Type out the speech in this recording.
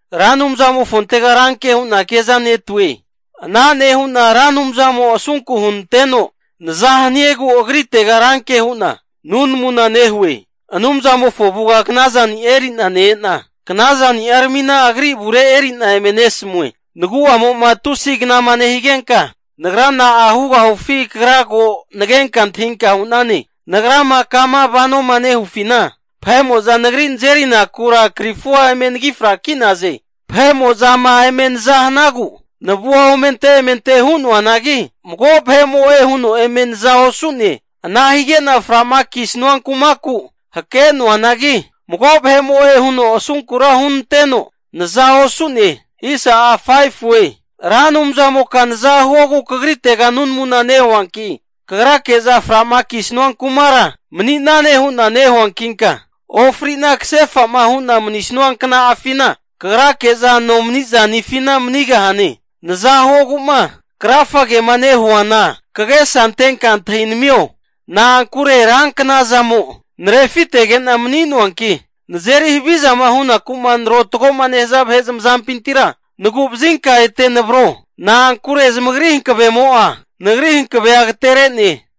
Ra Anumzamofontega ranke hu'na kezanetue. Ana nehu'na Ra Anumzamo asunku hunanteno naza haniegu agritega ranke hu'na nunamuna nehue. Anumzamofo avuga knazani'a eri'na ne-ena, knazani'aramina Agri avure eri'na eme nesamue. Nagu'amo'ma tusi knama nehigenka, nagra na'a hugahufi Kagra ko nagenka antahinka hu'nane. Nagrama kama vanoma nehufina vahe'mo'za nagri nazerinakura krifua eme anagi fraki'naze. Vahe'mo'zama eme naza hanagu navua omente emente hu'noanagi, mago vahe'mo'e huno eme naza osu'ne. Ana hige'na fra'ma kisanua kumaku hake'noanagi, mago vahe'mo'e huno asunkura hunanteno naza osu'ne. Ra Anumzamoka naza huogu Kagritega nunamuna nehuanki, Kagrake'za fra'ma kisanua kumara mani'nane hu'na nehuankinka, ofri'na kase'fama hu'na manisanua kna'afina Kagrake'za nomani zanifina manigahane. Naza huogu'ma krafagema nehuana, kagesa antenka antahinamio. Na'ankure ranknazamo narefitege'na mani'noanki, nazeri havizama hunaku'ma narotagoma nehaza vahe zamazampintira nagu'vazinka ete navro. Na'ankure zamagri hankavemo'a, nagri hankavea agatere'ne.